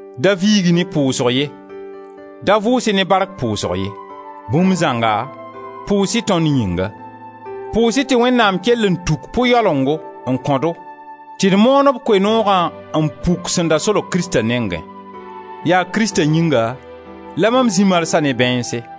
Da viig-y ne pʋʋsg ye, da vʋʋs-y ne bark pʋʋsg ye! Bũmb zãnga, pʋʋs-y tõnd yĩnga. Pʋʋs-y tɩ Wẽnnaam kell n tuk pʋ-yalengo n kõ-do tɩ d moon b Koe-noogã n puk sẽn da solg Krista nengẽ. Yaa Krista yĩnga la mam zĩ marsã ne bãeense.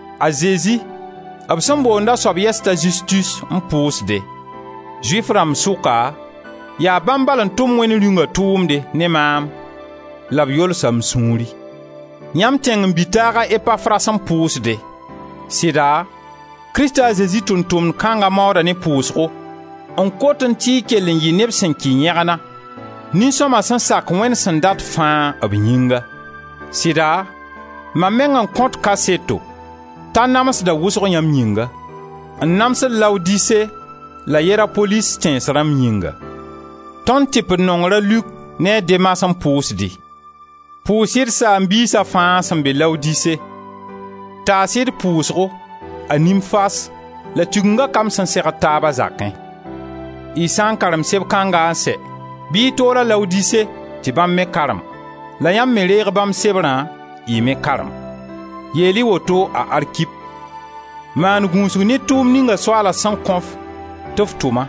A Zezi, b sẽn boond a sob yɛs t'a Zustus, n pʋʋsde. Zʋɩf rãmb sʋka, yaa bãmb bal n tʋm Wẽnd Rĩunga tʋʋmde ne maam la b yolsa m sũuri. Yãmb tẽngen-bi-taag a Epafras n pʋʋsde; sɩda Krista a Zezi tʋʋm-tʋmd kãnga maooda ne pʋʋsgo n kotẽ tɩ y kell n yɩ neb sẽn kɩ yẽgna, nin-sõma sẽn sak Wẽnd sẽn dat fãa b yĩnga. Sɩda, mam meng n kõt kaseto t'a namsda wʋsg yãmb yĩnga, n namsd Laodise la Yerapolis tẽns rãmb yĩnga. Tõnd tɩpd-nongr a Luk ne a Demas, n pʋʋsd-y. Pʋʋs-y d saam-biisa fãa sẽn be Laodise. Taas-y d pʋʋsgo a Nimfas la Tigenga kamb sẽn segd taab a zakẽ. Y sã n karem seb kãnga n sɛ bɩ y tool-a Laodise tɩ bãmb me karem, la yãmb me reeg bãmb sebrã, y me karem. Yeel-y woto a Arkip: «Maan gũusg ne tʋʋmd ninga Soaala sẽn kõ-f tɩ f tʋma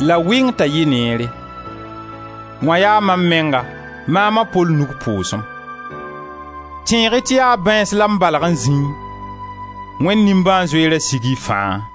la wɩng t'a yɩ neere.» Wã yaa mam menga, maam a Pol nug pʋʋsem. Tẽeg-y tɩ yaa bãeens la m balg n zĩẽ. Wẽnd nimbãan-zoeerã sig y fãa!